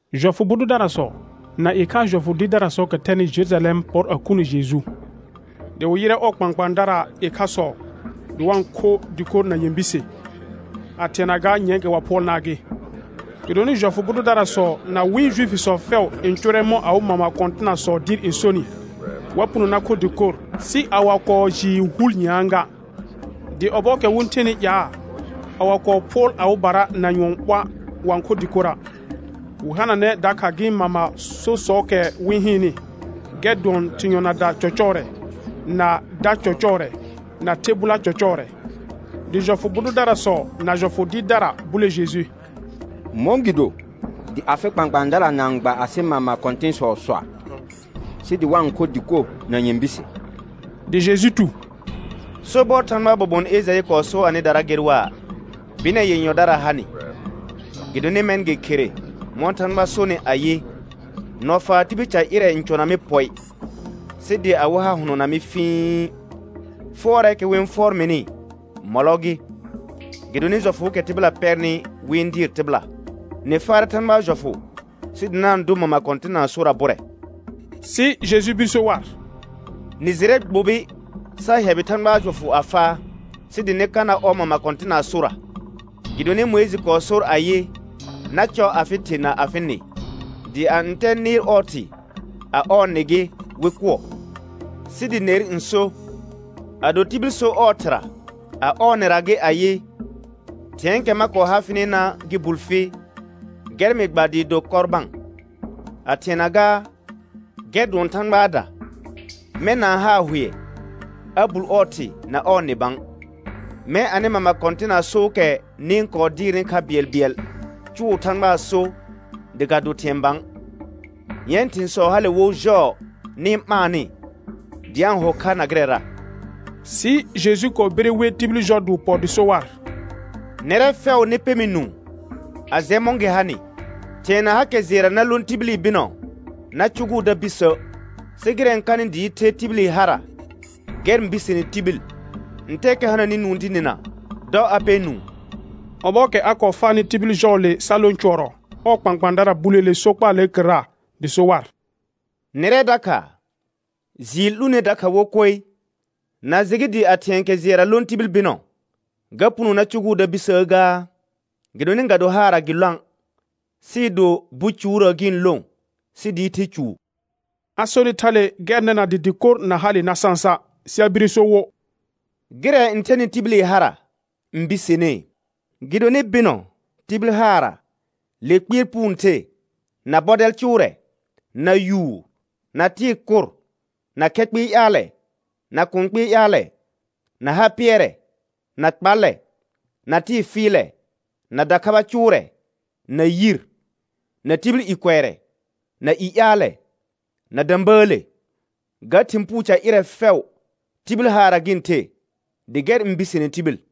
Jɔfʋ bʋ dʋdarasɔ na ɩkhaa jɔfʋ dɩɩrdarasɔɔkɛ thɛnɩ Jerujalɛm pɔr a khunə Jeju; dɩ wɩ yɩrɛ ɔɔ kpãkpãadaar ɩkhasɔ dɩ wa-n kho dɩkor na nyɛ̃ bise, a thɩɛna gaa nyɛ̃ɛkɛ wa phʋɔlnaa gɩ. Gɩdonɩ jɔfʋ bʋ dʋdarasɔ na wɩ̃ Juifisɔ fɛʋ n cʋʋrɛ mɔ̃ awɩ mama kɔ̃tɩnasɔɔ dɩɩr n sonɩ, wa puno na kho dɩkor sɩ a wa kɔɔ jɩɩ hul nyɛ̃aa ga. Dɩ ɔbɔɔkɛ wɩ-n thenɩ ƴaa, a wa kɔɔ phʋɔl awɩbara na nyʋɔn ɓoa', wa-n kho dɩkora'. Wɩ hananɛ dakha gɩ̃ mama sosɔɔkɛ wɩ-n hɩɩnnɩ, gɛr dʋɔn thɩ̃ yɔnada cɔcɔɔrɛ, na da cɔcɔɔrɛ, na the bʋla cɔcɔɔrɛ. Dɩ jɔfʋ bʋ dʋdarasɔ na jɔfʋ dɩɩrdara bule Jeju: Mɔ̃gɩdo dɩ afɩ kpãkpãadara na-n gba asɩ mama kɔ̃tɩ̃sɔɔ soa', sɩ dɩ wa-n kho dɩkor na nyɛ̃ bise? Dɩ Jeju tu: Sobɔr Thãgbaa bobon Ejaɩ kɔɔ so anɩdara ger waa: Bɩnɛ yenyɔdara ha nɩ, gɩdonɩ mɛ̃ gɩ khere mɔ̃ Thãgba sonɩ ayɩ: «Nɔfaar tibil ca ƴɩrɛ n cʋna mɩ pɔɩ, sɩ dɩ awɩ ha hʋnɔna mɩ fĩi. Fʋɔrɛɛkɛ wɩ-n fʋɔr mɩnɩ, mɔlɔ gɩ, gɩdonɩ jɔfʋʋkɛ tɩbɩla pɛrnɩ wɩ-n dɩɩr tɩbɩla.» Nɩ faarɛ Thãgbaa jɔfʋ sɩ dɩ na-n dʋ mama kɔ̃tɩnaa sora bʋrɛ. Sɩ Jeju bir so war: Nɩ jɩrɛ gbobi sa hɛbɩ Thãgbaa jɔfʋ a faa, sɩ dɩ nɩ ka na ɔ mama kɔ̃tɩnaa sora. Gɩdonɩ Mʋɩjɩ kɔɔ sor ayɩ: «Na cɔ afɩ thɩ na afɩ nɩ» dɩ «a ntɛ nɩɩr ɔɔ thɩ, a ɔɔ nɩ gɩ, wɩ kʋɔ.» Sɩ dɩ ner n so: Ado tibil so ɔɔ ɩhɩra a ɔɔ nɩra gɩ ayɩ: Thɩ̃ɛɛkɛ ma kɔɔ ha fɩnɩna gɩ bul fi, gɛr mɩ gba dɩɩ do Kɔrbã, a thɩɛna gaa, gɛr dʋɔn Thãgbaada; mɛ̃ na-n haa hʋɛ a bul ɔɔ thɩ na ɔɔ nɩ bã. Mɛ̃ anɩ mama kɔ̃tɩnaa sookɛ nɩ-n kɔɔ dɩɩrnɩ kha bɩɛlbɩɛl cʋʋ Thãgbaa so dɩ ga do thɩ̃ɛ bã. Yɛ̃ thɩ̃sɔ hale wo jɔɔ nɩ-n ɓaannɩ dɩ a-n ho kha na gɩrɛra. Sɩ Jeju kɔɔ bire we tibil jɔ dɩ wɩ pɔ dɩ so war: Nɛrɛ fɛʋ nɩ pɛ mɩ nũu a jɛ mɔ̃ gɩ hanɩ. Thɩ̃ɛ na hakɛ jɩɛra na lõ tibili bɩnɔ na cʋgʋʋ da bisə', sɩ gɩrɛ n kanɩ dɩɩ the tibili hara gɛr n bisene tibil. [Ntɛɛkɛ hananɩ nũu dɩ nɩna, dɔ a pɛ nũu.] Ɔbɔɔkɛ a kɔɔ faanɩ tibil jɔɔle sa lõ cʋɔrɔ, ɔɔ kpãkpãadara buleele sokpaalee kɩrra. Dɩ so war: Nɛrɛ dakha jɩɩr 'lũ ner dakha wo koe. Na jɩ gɩ dɩ a thɩ̃ɛ kɛ jɩɛra lõ tibil bɩnɔ, ga puno na cʋgʋʋ da bisəə gaa? Gɩdonɩ ga do haarra gɩ lõa', sɩɩ do bucuurə gɩ-n lõ sɩ dɩɩ the cuu. A sonɩ thale gɛr nɛna dɩ dɩkor na hale na sãsa'. Sɩ a bire so wo: Gɩrɛ n thɛnɩ tibili hara n bisenee. Gɩdonɩ bɩnɔ, tibil haarra, le kpɩɛr puu n the, na bɔdɛl cʋʋrɛ, na yuur, na tɩɩ kʋr, na khɛ kpɩɩ ƴaalɛ, na kũu kpɩɩ ƴaalɛ, na ha pɩɛrɛ, na kpallɛ, na tɩɩ fɩɩlɛ, na dakhaba cʋʋrɛ, na yir, na tibil i kʋɛrɛ, na i ƴaalɛ, na də̃bəəle. Ga thɩ̃ puu ca ƴɩrɛ fɛʋ, tibil haarra gɩ-n the, dɩ gɛr n bisene tibil.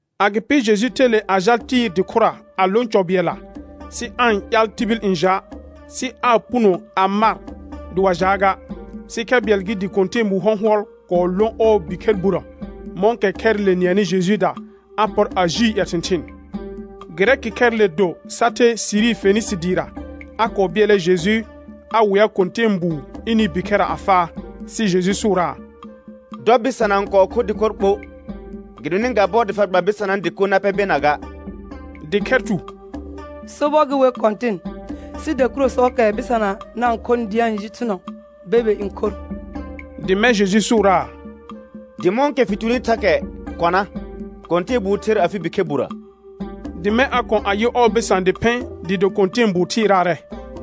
Agɩpɩ Jeju the le a jal Tɩɩr dɩ khʋra a lõ cɔ bɩɛlla, sɩ aa-n ƴaal tibil n ja'; sɩ aa puno a mar dɩ wa jaa ga. Sɩ khɛ bɩɛl gɩ dɩ kɔ̃tɛɛbu hɔ̃hɔl kɔɔ lõ ɔɔ bikhɛr burə; mɔ̃kɛ khɛrɩle nɩɛnɩ Jejuuda, a pɔr a jii ƴɛ thɩ̃thɩɩn. Gɩrɛkɩ khɛrɩle do sa the Siri Fenɩsɩ dɩɩra; a kɔɔ bɩɛlɛ Jeju a wea kɔ̃tɛɛbuu ɩnɩ bikhɛrra a faa. Sɩ Jeju sʋʋraa: Dɔ bɩsana n kɔɔ kho dɩkor ɓo, gɩdonɩ ga bɔr dɩ fa gba bɩsanaa dɩko na pɛ bena ga. Dɩ khɛr tu: Sobɔr gɩ wer Kɔ̃tɩn, sɩ dakurusɔɔkɛ bɩsana na-n khonɩ dɩ ga-ɩɩ ji thʋuɔ, bebe n khor. Dɩ mɛ̃ Jeju sʋʋraa: Dɩ mɔ̃kɛ fɩ tuni thakɛ kɔna, kɔ̃tɛɛbuu ther afɩ bikhɛr burə. Dɩ mɛ̃ a kɔ̃ a yɩ ɔɔ bɩsã dɩ phɩ̃, dɩɩ do kɔ̃tɛɛbuu thɩɩraarɛ.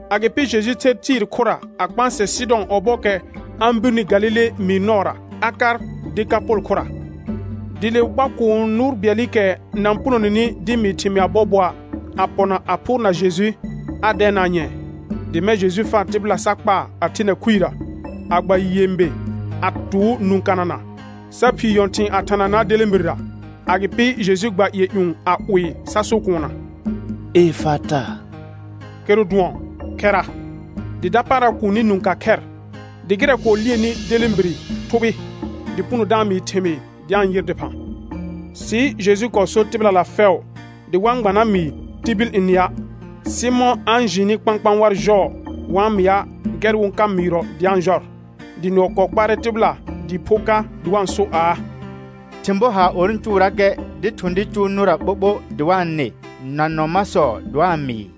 Agɩpɩ Jeju ther Tɩɩr khʋra, a kpãsɛ Sɩdɔ̃ ɔbɔɔkɛ a-n birni Galile mɩɩr nɔɔra, a kar Dekapol khʋra. Dɩ le wɩ kpa kũu nʋʋr bɩɛlɩkɛ na-n punoneni dɩ mɩɩ thɩmɩa bɔɔbɔa', a pɔna a phʋʋrna Jeju, a dɛɛnaa nyɛ̃ɛ. Dɩ mɛ̃ Jeju faa tɩbɩla sa kpaa, a thena khuirə, a gba nyɛ̃be a tʋʋ nũ kanana, sa phii nyɔ̃thɩ̃ɩ a thananaa delẽbirera. Agɩpɩ Jeju gba ƴɩɛ ƴũ a 'wɩɩ sa so kuunna: Efata, kɩrʋ dʋɔn: Khɛra. Dɩ dapaara kuuni nũ ka khɛr, dɩ gɩrɛ kɔɔ lieni delẽbire thʋbɩ, dɩ puno da-n mɩɩ thɩmɩɩr dɩ a-n yɩr dɩphã. Sɩ Jeju kɔɔ sor tɩbɩlala fɛʋ, dɩ wa-n gba na mɩɩ tibil n nɩa'. Sɩ mɔ̃ a-n jɩɩnɩ kpãkpãa war jɔɔ wa-n mɩa', gɛr wɩ-n ka mɩɩrɔ dɩ a-n jɔr. Dɩ nʋɔ kɔɔ kpaarɛ tɩbɩla dɩɩ pho ka dɩ wa-n so aa: Thɩ̃ bɔ haar or n cʋʋrakɛ dɩ thʋ̃ dɩ cʋʋ nʋra ɓoɓo dɩ wa-n nɩ na nɔ masɔ dɩ wa-n mɩɩ.